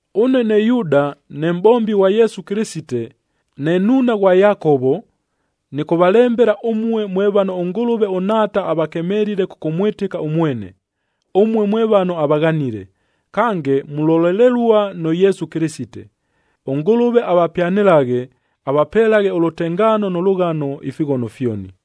Ʉne ne Yuuda, ne mʼbombi ghwa Yesu Kɨlɨsite, ne nnuuna ghwa Yakovo, nɨkʉvalembela ʉmue mwe vano ʉNgʉlʉve ʉNhaata avakemelile kʉkʉmwɨtɨka ʉmwene, ʉmue mwe vano avaghanile, kange mulolelelua nʉ Yesu Kɨlɨsite. ɄNgʉlʉve avapyanɨlaghe, avapelaghe ʉlʉtengaano nʉ lʉghano ifighono fyoni.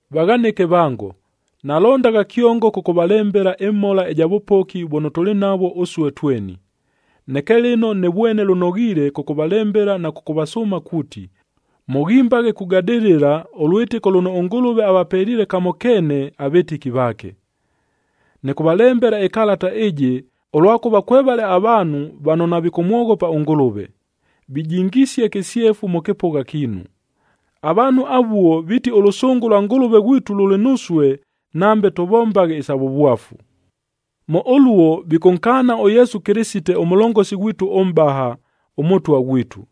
Vaghanɨke vango, nalondagha kyongo kʉkʉvalembela ɨmhola ɨja vʉpoki vʉno tʉlɨ navwo ʉsue tweni. Neke lɨno nɨvwene lʉnoghiile kʉkʉvalembela na kʉkʉvasʉʉma kuuti, mʉghimbaghe kugadɨlɨla ʉlwɨtɨko lʉno ʉNgʉlʉve avapeliile kamo keene avɨtɨki vaake. Nɨkʉvalembela ɨkalata ɨjɨ, ʉlwakʉva kwevale avaanhu vano navikʉmwoghopa ʉNgʉlʉve, vijingisie kɨsyefu mʉ kɨpʉgha kiinu. Avaanhu avuo viiti ʉlʉsʉngʉ lwa Ngʉlʉve ghwitu lʉlɨ nusue, nambe tʉvombaghe isa vʉvwafu. Mʉ ʉluo vikʉnkaana ʉYesu Kɨlɨsite ʉMʉlongosi ghwitu ʉMʼbaha, ʉMʉtwa ghwitu.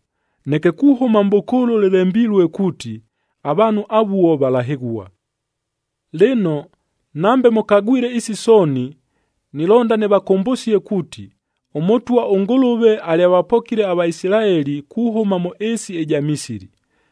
Neke kuhʉma mʼbʉkʉʉlʉ lɨlembilue kuuti, avaanhu avuo valahɨghua. Lɨno, nambe mʉkagwile isi sooni, nilonda nɨvakʉmbʉsie kuuti, ʉMʉtwa ʉNgʉlʉve alyavapokile aVaisilaeli kuhʉma mʉ ɨɨsi ɨja Misili,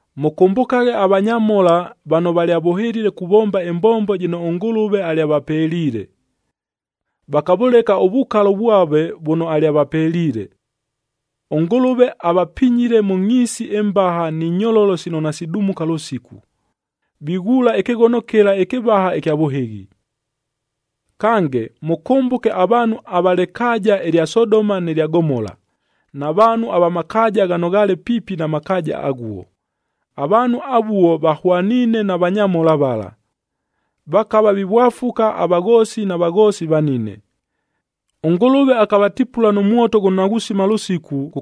Mʉkʉmbʉkaghe avanyamhola vano valyavʉhɨlile kuvomba ɨmbombo jɨno ʉNgʉlʉve alyavapeliile, vakavʉleka ʉvukalo vwave vʉno alyavapeliile. ɄNgʉlʉve avapinyile mʉ ngʼhiisi ɨmbaha ni nyololo sino nasidumuka lʉsiku, vighuula ɨkɨghono kɨla ɨkɨvaha ɨkya vʉhɨghi. Kange, mʉkʉmbʉke avaanhu ava lɨkaaja ɨlya Sodoma nɨ lya Gomola, na vaanhu ava makaaja ghano ghaale piipi na makaaja aghuo. Avaanhu avuo vahwaniine na vanyamhola vala. Vakava vivwafuka avaghoosi na vaghoosi vanine. ɄNgʉlʉve akavatipula nʉ mwoto ghʉno naghusima lʉsiku,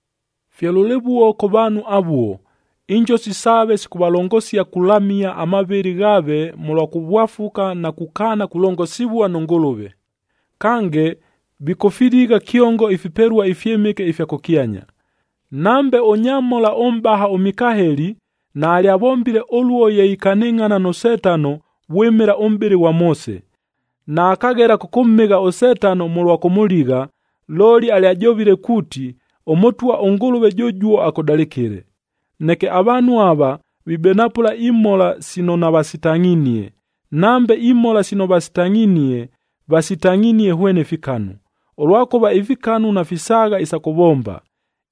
Fye lʉlɨvuo kʉ vaanhu avuo, injosi saave sikʉvalongosia kulamia amavɨlɨ ghaave mʉlwa kʉvwafuka na kukaana kulongosivua nʉ Ngʉlʉve. Kange, vikʉfiligha kyongo ifipelua ifyɨmɨke ifya kʉkyanya. Nambe ʉnyamhola ʉmʼbaha ʉMikaeli naalyavombile ʉluo ye ikanɨngʼhana nʉ Setano vwɨmɨla ʉmʼbɨlɨ ghwa Moose, naakaghela kʉkʉmhɨgha ʉSetano mʉlwa kʉmʉligha, looli alyajovile kuuti, “ɄMʉtwa ʉNgʉlʉve jʉjuo akʉdalɨkɨle!” Neke avaanhu ava, vibenapʉla imhola sino navasitangʼhinie. Nambe imhola sino vasitangʼhinie, vasitangʼhinie hwene fikanu, ʉlwakʉva ifikanu nafisaagha isa kʉvomba.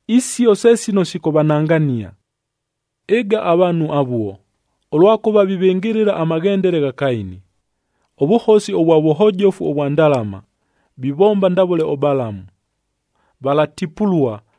Isio se sino sikʉvanangania. Ɨga, avaanhu avuo! Ʉlwakʉva vivɨngɨlɨla amaghendele gha Kaini.c Ʉvʉhosi ʉvwa vʉhojofu vwa ndalama, vivomba ndavʉle ʉBalamu.d Valatipulua,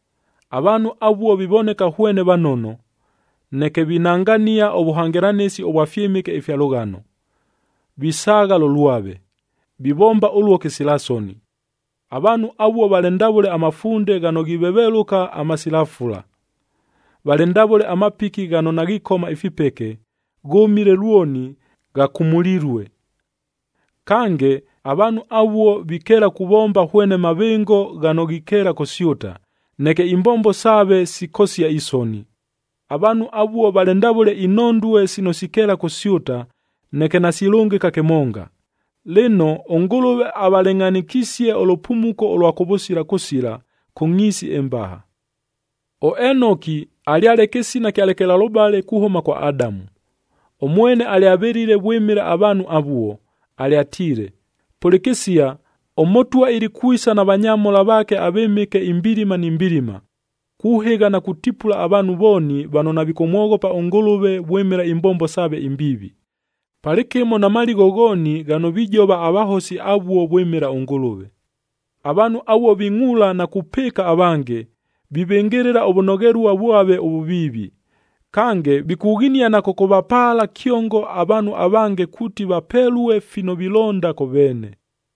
Avaanhu avuo vivoneka hwene vanono,f neke vinangania ʉvʉhangɨlanɨsi ʉvwa fyɨmɨke ifya lʉghano, visaagha lʉ lwave. Vivomba ʉluo kɨsila soni. Avaanhu avuo valɨ ndavʉle amafunde ghano ghivevelʉka, amasila fula. Valɨ ndavʉle amapiki ghano naghikoma ifipeke, ghʉmile lwoni, ghakumulilue. Kange, avaanhu avuo vikeela kʉvomba hwene mavɨngo ghano ghikeela kʉsyʉta, neke imbombo saave sikosia isoni. Avaanhu avuo valɨ ndavʉle inhondue sino sikeela kʉsyʉta, neke nasilʉngɨka kɨmonga. Lɨno, ʉNgʉlʉve avalɨngʼhanɨkisie ʉlʉpumuko ʉlwa kʉvʉsila kʉsila, kʉ ngʼhiisi ɨmbaha. ɄEnoki, alyale kɨsina kya lekelalʉbale kuhʉma kwa Adamu.g Ʉmwene alyavɨlile vwɨmɨla avaanhu avuo, alyatiile, “Pʉlɨkɨsia, ʉMʉtwa ilikwisa na vanyamhola vaake avɨmɨke imbilima ni mbilima, kuhɨgha na kutipula avaanhu vooni vano navikʉmwoghopa ʉNgʉlʉve vwɨmɨla imbombo saave imbiivi, palɨkɨmo na maligho ghooni ghano vijova avahosi avuo vwɨmɨla ʉNgʉlʉve.” Avaanhu avuo vingʼuula na kupɨɨka avange, vivɨngɨlɨla ʉvʉnoghelua vwave ʉvʉviivi. Kange, vikughinia na kʉkʉvapaala kyongo avaanhu avange kuuti vapelue fino vilonda kʉ veene.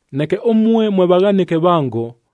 Neke ʉmue mwe vaghanɨke vango,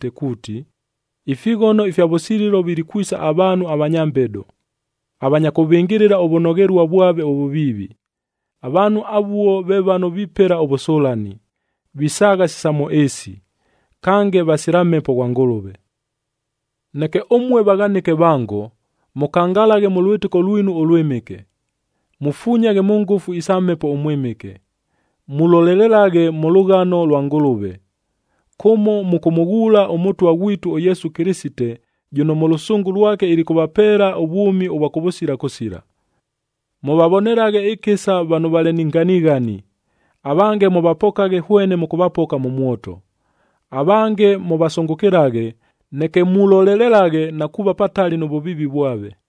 kuuti, “Ifighono ifya vʉsililo vilikwisa avaanhu avanya mbedo, avanya kʉvɨngɨlɨla ʉvʉnoghelua vwave ʉvʉviivi.” Avaanhu avuo ve vano vipela ʉvʉsʉlani, visaagha si sa mʉ ɨɨsi, kange vasila Mhepo ghwa Ngʉlʉve. Neke ʉmue vaghanɨke vango, mʉkangalaghe mʉ lwɨtɨko lwinu ʉlwɨmɨke, mufunyaghe mʉ ngʉfu isa Mhepo ʉMwɨmɨke. Mulolelelaghe mʉ lʉghano lwa Ngʉlʉve, kʉmo mʉkʉmʉghuula ʉMʉtwa ghwitu ʉYesu Kɨlɨsite jʉno mʉ lʉsʉngʉ lwake ilikʉvapeela ʉvwʉmi ʉvwa kʉvʉsila kʉsila. Mʉvavonelaghe ɨkɨsa vano valɨ ni nganighani, avange mʉvapokaghe hwene mʉkʉvapoka mʉ mwoto. Avange mʉvasʉngʉkɨlaghe, neke mulolelelaghe na kuuva patali nʉ vʉviivi vwave.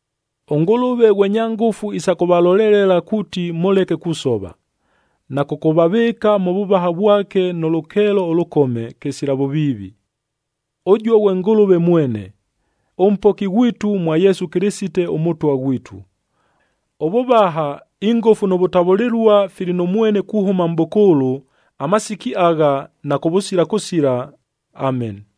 ɄNgʉlʉve ghwe nya ngʉfu isa kʉvalolelela kuuti mʉleke kusova, na kʉkʉvavɨɨka mʉ vʉvaha vwake nʉ lʉkeelo ʉlʉkome, kɨsila vʉviivi. Ʉjuo ghwe Ngʉlʉve mwene, ʉMpoki ghwitu mwa Yesu Kɨlɨsite ʉMʉtwa ghwitu. Ʉvʉvaha, ingʉfu nʉ vʉtavʉlɨlua fili nʉ mwene kuhʉma mʼbʉkʉʉlʉ, amasiki agha, na kʉvʉsila kʉsila. Ameni!